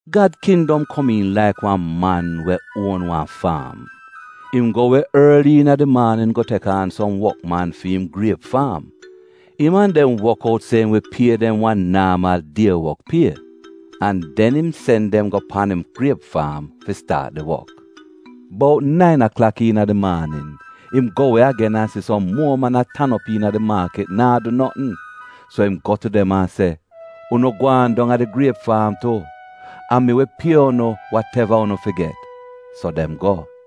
“Gad kindom komiin laik wan man we uon wan faam. Im go we orli iina di maanin go tek aan som wokman fi im griep faam. Im an dem wok out se im wi pie dem wan naamal die wok pie, an den im sen dem go pan im griep faam fi staat di wok. “Bout nain aklak iina di maanin, im go we agen an si som muo man a tan op iina di maakit naa du notn. So im go tu dem an se, ‘Unu gwaan dong a di griep faam tu, an mi wi pie unu wateva unu fi get.’ So dem go.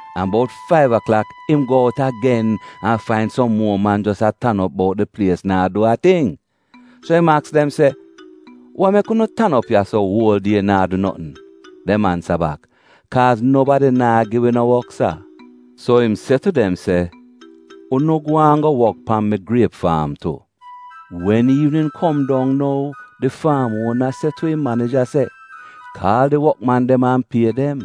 An bout faiv aklak im go out agen an fain som muo man jos a tan op bout di plies naa du a ting. So im aks dem se, ‘Wa mek unu tan op ya-so uol die naa du notn?’ “Dem ansa bak, ‘Kaaz nobadi naa gi wi no wok sa.’ “So im se tu dem se, ‘Unu gwaan go wok pan mi griep faam tu.’ “Wen iivnin kom dong nou di faam uona se tu im manija se, ‘Kaal di wokman dem an pie dem.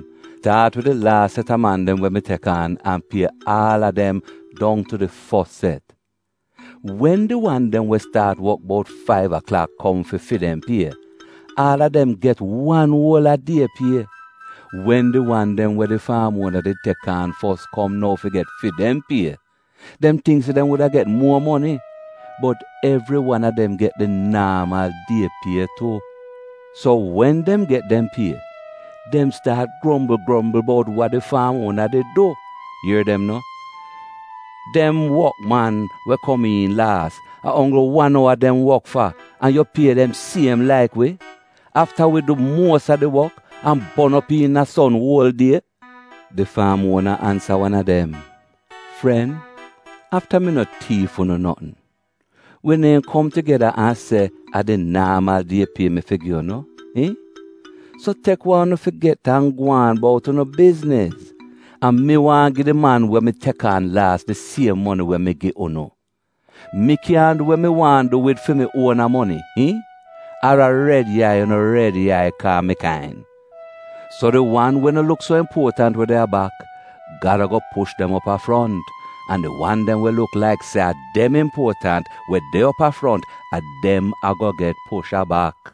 Staat wid di laas set a man dem we mi tek aan, an pie aal a dem dong tu di fos set.’ “Wen di wan dem we staat wok bout faiv aklak kom fi fi dem pie, aal a dem get wan uol a die pie. Wen di wan dem we di faam uona did tek aan fos kom nou fi get fi dem pie, dem tingk se dem wuda get muo moni. Bot evri wan a dem get di naamal die pie tu. So wen dem get dem pie, dem staat grombl grombl bout wa di faam uona did du; ier dem no, ‘Dem wokman, we kom iin laas, a onggl wan owa dem wok fa an yu pie dem siem laik wi, afta a wi du muos a di wok an bon op iina son uol die.’ “Di faam uona ansa wan a dem, ‘Fren, afta mi no tiif unu notn. Wi neehn kom tugeda an se a di naamal die pie mi fi gi unu? Iihn? So tek wa unu fi get an gwaan bout unu bizniz. A mi waahn gi di man we mi tek aan laas di siem moni we mi gi unu. Mi kyaahn du we mi waahn du wid fi mi uona moni? Iihn? Ar a red yai unu red yai kaa mi kain?’ “So di wan we no luk so impuotant we de a bak, Gad ago push dem op a front, an di wan dem we luk laik se a dem impuotant, we de op a front, a dem ago get push a bak.”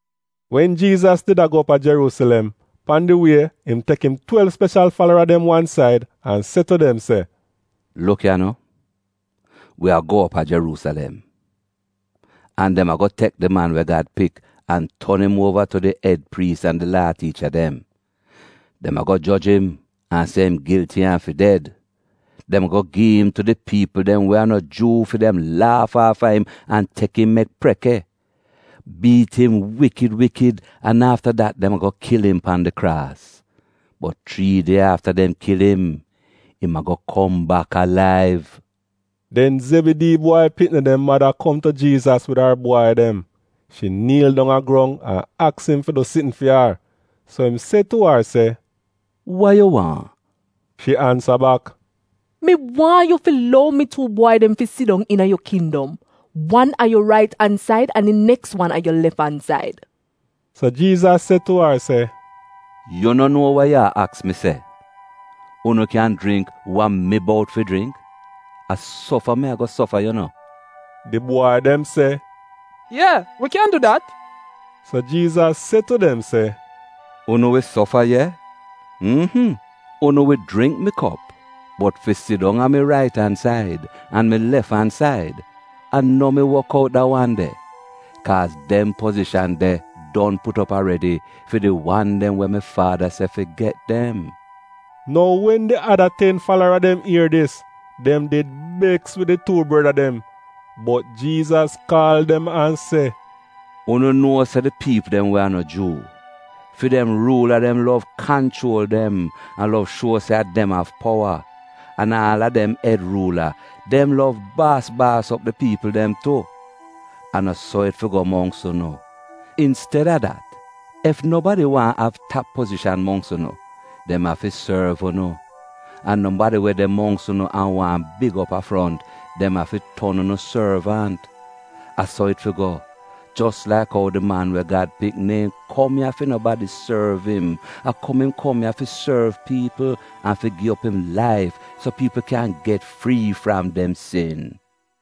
Wen Jiizas did a go op a Jeruusilem, pan di wie, im tek im twelv speshal falara dem wan said an se tu dem se, “Luk ya no, wi a go op a Jeruusilem, an dem ago tek di Man we Gad Pik an ton im uova tu di ed priis an di Laa tiicha dem. Dem ago joj im an se im gilti an fi ded. Dem ago gi'im tu di piipl dem we a no Juu fi dem laaf aafa im an tek im mek preke, biit im wikid wikid an afta dat dem ago kil im pan di kraas. Bot chrii die afta dem kil im, im ago kom bak alaiv.” Den Zebidii bwai pikni dem mada kom tu Jiizas wid ar bwai dem. Shi niil dong a grong an aks im fi du sitn fi ar. So im se tu ar se, “Wa yu waahn?” Shi ansa bak, “Mi waahn yu fi lou mi tuu bwai dem fi sidong iina yu kindom, wan a yu rait an said an di neks wan a yu lef-an-said.” So Jiizas se tu ar se, “Yu no nuo wa yu a aks mi se! Unu kyan jringk wa mi bout fi jringk? A sofa mi ago sofa yu no.” Di bwai dem se, “Ye, wi kyan du dat!” So Jiizas se tu dem se, “Unu wi sofa ye; mmhm — unu wi jringk mi kop, bot fi sidong a mi rait an said an mi lef-an-said, a no mi wok out da wan de. Kaaz dem pozishan de don put op aredi fi di wan dem we mi Faada se fi get dem.” Nou wen di ada ten falara dem ier dis, dem did beks wid di tuu breda dem. Bot Jiizas kaal dem an se, “Unu nuo se di piipl dem we a no Juu, fi dem ruula dem lov kanchuol dem an lov shuo se a dem av powa, an aal dem ed ruula — dem lov baas baas op di piipl dem tu. A no so it fi go mongks unu! Insteda dat, ef nobadi waahn av tap pozishan mongks unu, dem afi sorv unu, an nobadi we de mongks unu an waahn big op a front, dem afi ton unu sorvant. A so it fi go, jos laik ou di Man we Gad Pik neehn kom ya fi nobadi sorv im; a kom im kom ya fi sorv piipl an fi gi op im laif so piipl kyan get frii fram dem sin.”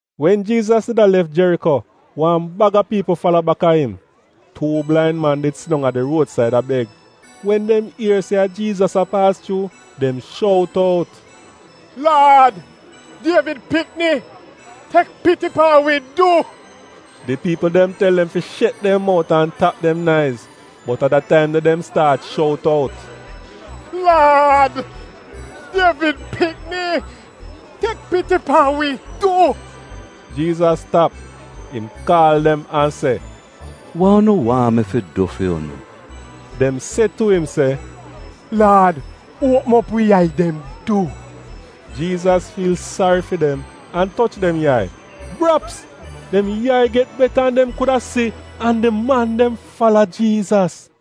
Wen Jiizas did a lef Jeriko, wan bag a piipl fala baka im. Tuu blain man did sidong a di ruodsaid a beg. Wen dem ier se a Jiizas a paas chuu, dem shout out, “Laad, Dievid pikni, tek piti pan wi du!” Di piipl dem tel dem fi shet dem mout an tap dem naiz, bot a dat de taim dem staat shout out, “Laad, Dievid pikni, tek piti pan wi du!” Jiizas tap. Im kaal dem an se, “Wa unu waahn mi du fu'unu?” Dem se tu im se, “Laad uopm op wi yai dem, du.” Jiizas fiil sari fi dem an toch dem yai — Braps! Dem yai get beta an dem kuda si, an di man dem fala Jiizas.